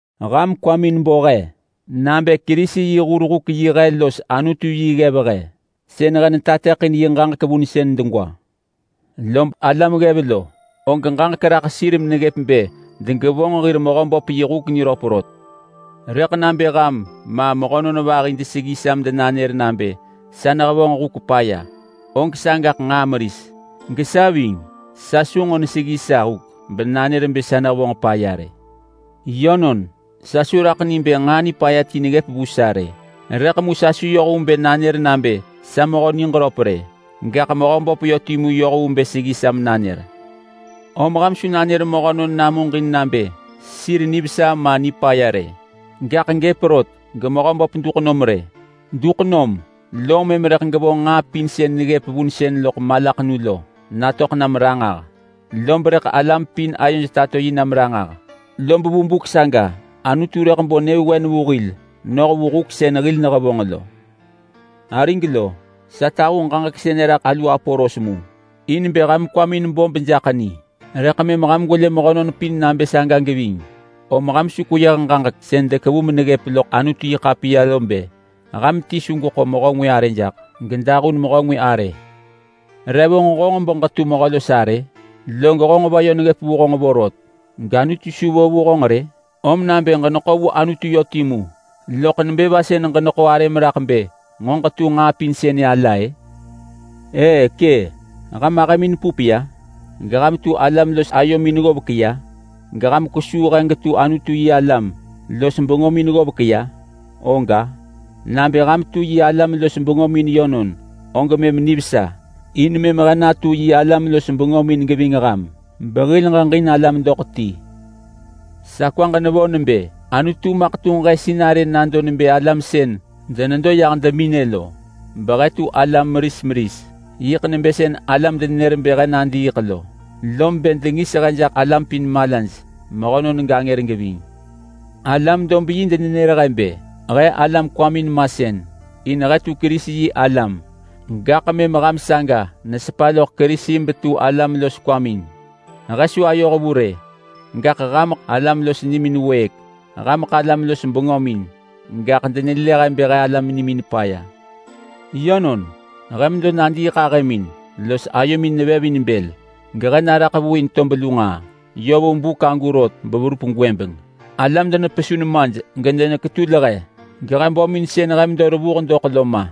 Ham kwamin bo he nabë Kerisi yi hur huk-yi he los Anutu yi ggev he sën he netateḳin yi ġaġek vunsën degwa. Lob alam ggev lo og ġaġek raḳ sir meneggëp bë degevonġ hir mehöböp yi huk niröp rot. Rëḳ nabë ham ma, mehönon vahi deseggi sa medenanër nabë sa nehevonġ huk paya, og sagaḳ nġaa meris. Gesa ving, sa su nġo neseggi sa huk benanër nebë sa nehevonġ paya rë. Yönon, sa su raḳ ni bë nġaa nipaya ti neggëp vu sa rë, rëḳ mu sa su yoh vu bë nanër nabë sa mehö niġröp rë. Gaḳ Mehöböp yö timu yoh vu bë seggi sa menanër. Om ham su nanër mehönon namuġin nabë sir nivesa ma nipaya. Gaḳ gëp rot geMehöböp duḳ nom rë. Duk nom lom mëm rëḳ gevonġ nġaa pin sën neggëp vunsën loḳ malaḳenu lo natöḳ nam ranġah, lob rëḳ alam pin ayoj tato yi nam ranġah. Lob vu buk saga Anutu rëḳ bo nyëvewen vu hil noh vu huk sën hil nehevonġ lo. Arig lo, sa tahu ġaġek sënë raḳ alu Apolos mu, in bë ham kwamin bo bejaḳ ni rëḳ mëm ham gwelë mehönon pin nabë saga geving. Om ham su kweyëh ġaġek sën dekevu meneggëp loḳ Anutu-yi-ḳapiya lo bë, “Ham ti su geḳo mehö ngwë arë jaḳ gedahun mehö ngwë arë.” Re vonġ honġ beġetu mehö los arë? Log honġ va yö neggëp vu honġ vorot gAnutu su vo vu honġ rë? Om nabë ġeneḳo vu Anutu yö timu, loḳ nebë va sën ġeneḳo arëm raḳ bë nġo ġetu nġaa pin sënë ala-ë? Ë kë! Ham ahëmin pup ya? Geham tu alam los ayomin ggovek ya? Geham kwesuu he getu Anutu-yi-alam los bengömin ggovek ya? Oga! Nabë ham tu yi alam los bengömin yönon, og mëm nivesa! In mëm he natu yi alam los bengömin geving ham behil ġeġin alam doḳ ti. Sa kwaġ nevo nebë Anutu maḳ tunġ he sinarë nado nebë alam sën denedo yah deminë lo, behe tu alam meris meris. Yiḳ nebë sën alam denenër bë he nadiiḳ lo, lob bë dengis he jaḳ alam pin malaj, mehönon gangër geving. Alam-dob-yi denenër he nebë he alam kwamin masën in he tu Kerisi-yi-alam, gaḳ mëm ham saga nesepa loḳ Kerisi betu alam los kwamin. He su ayoh vu rë, gaḳ hameḳ alam los nimin wëëk. Hameḳ alam los bengömin, gaḳ denelë he bë he alam nimin paya. Yönon, he medo nadiiḳahëmin los ayomin nevev in bël, gehe naraḳ vu in tob lu nġaa yö vu buk agu rot beverup gwëbeng. Alam denepesu nemaj gedeneketul he, gehe bömin sën he medo revuh doḳ lo ma.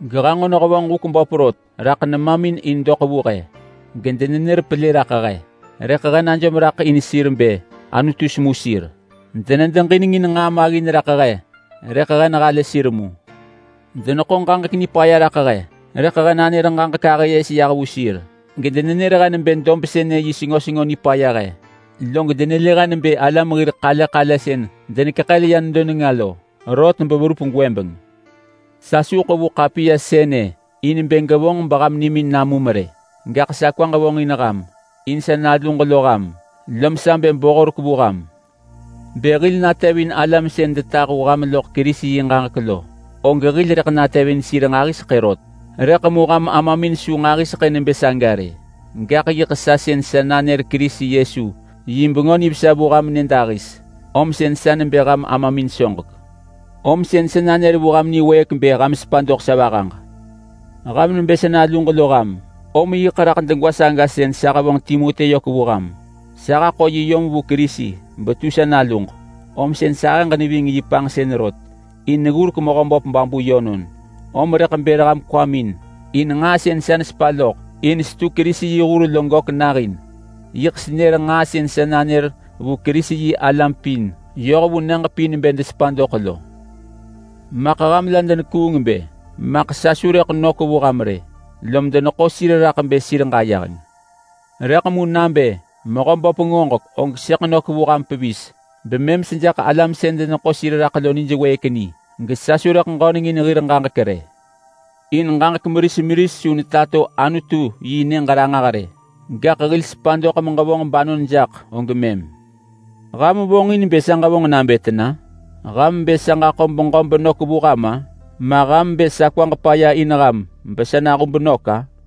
Gehe nġo nehevonġ huk böp rot raḳ nemamin in doḳ vu he. Gedenenër pelë raḳ he, rëḳ he najom raḳ in sir bë Anutu semu sir. Denedeġinengin nġaa maggin raḳ he, rëḳ he nehalë sir mu. Deneḳo ġaġek nipaya raḳ he, rëḳ he nanër ġaġek ahë yes yah vu sir. Gedenenër he nebë dob sënë yi sengo sengo nipaya he, log denelë he nebë alam hir ḳale ḳale sën denekeḳël ya nedo nenga lo. Rot beverup gwëbeng. Sa su ḳevu ḳapiya sënë in bë ġevonġ beham nimin namum rë. Gaḳ sa kwaġ vonġin ham in sa naluġ lo ham, lom sa bë bo horek vu ham. Bë hil natevin alam sën detahu ham loḳ Kerisi yi ġaġek lo, og hil rëḳ natevin sir nġahiseḳë rot, rëḳ mu ham amamin su nġahiseḳë nebë saga rë. Gaḳ yiḳ sa sën sa nanër Kerisi Yesu yi Bengö Nivesa vu ham nyëdahis, om sën sa nebë ham amamin soġek. Om sën sa nanër vu ham niwëëk bë ham sepa doḳ sa vahaġ. Ham nebë sa naluġ lo ham, om yiḳ raḳ degwa saga sën sa hevonġ Timoti yök vu ham. Sa haḳo yi yom vu Kerisi betu sa naluġ, om sën sahëġ neving yi panġsën rot in neggurek Mehöböp babu yönon. Om rëḳ bër ham kwamin in nġaa sën sa nesepa loḳ in setu Kerisi yi hur lo gök nahin. Yiḳ senër nġaa sën sa nanër vu Kerisi-yi-alam pin yoh vu nyëġ pin bë desepa doḳ lo. Maḳ ham la denekuung bë maḳ sa su rëḳ nök vu ham rë, lom deneḳo sir raḳ bë sir ġayeheng. Rëḳ mu nabë Mehöböp ngoġek, og sëḳ nök vu ham pevis bemëm sejaḳ alam sën deneḳo sir raḳ lo nij wëëk ni, gesa su rëḳ ġöneng in hir ġaġek rë. In ġaġek meris meris su netato Anutu yi nyëġ ranġah rë, gaḳ hil sepa doḳ meġevonġ banon jaḳ og mëm. Ham vonġin bë sa ġevonġ nabë tena? Ham bë sa ġaḳo beġö benök vu ham-a? Ma ham bë sa kwaġ paya in ham besa nahub nök-a?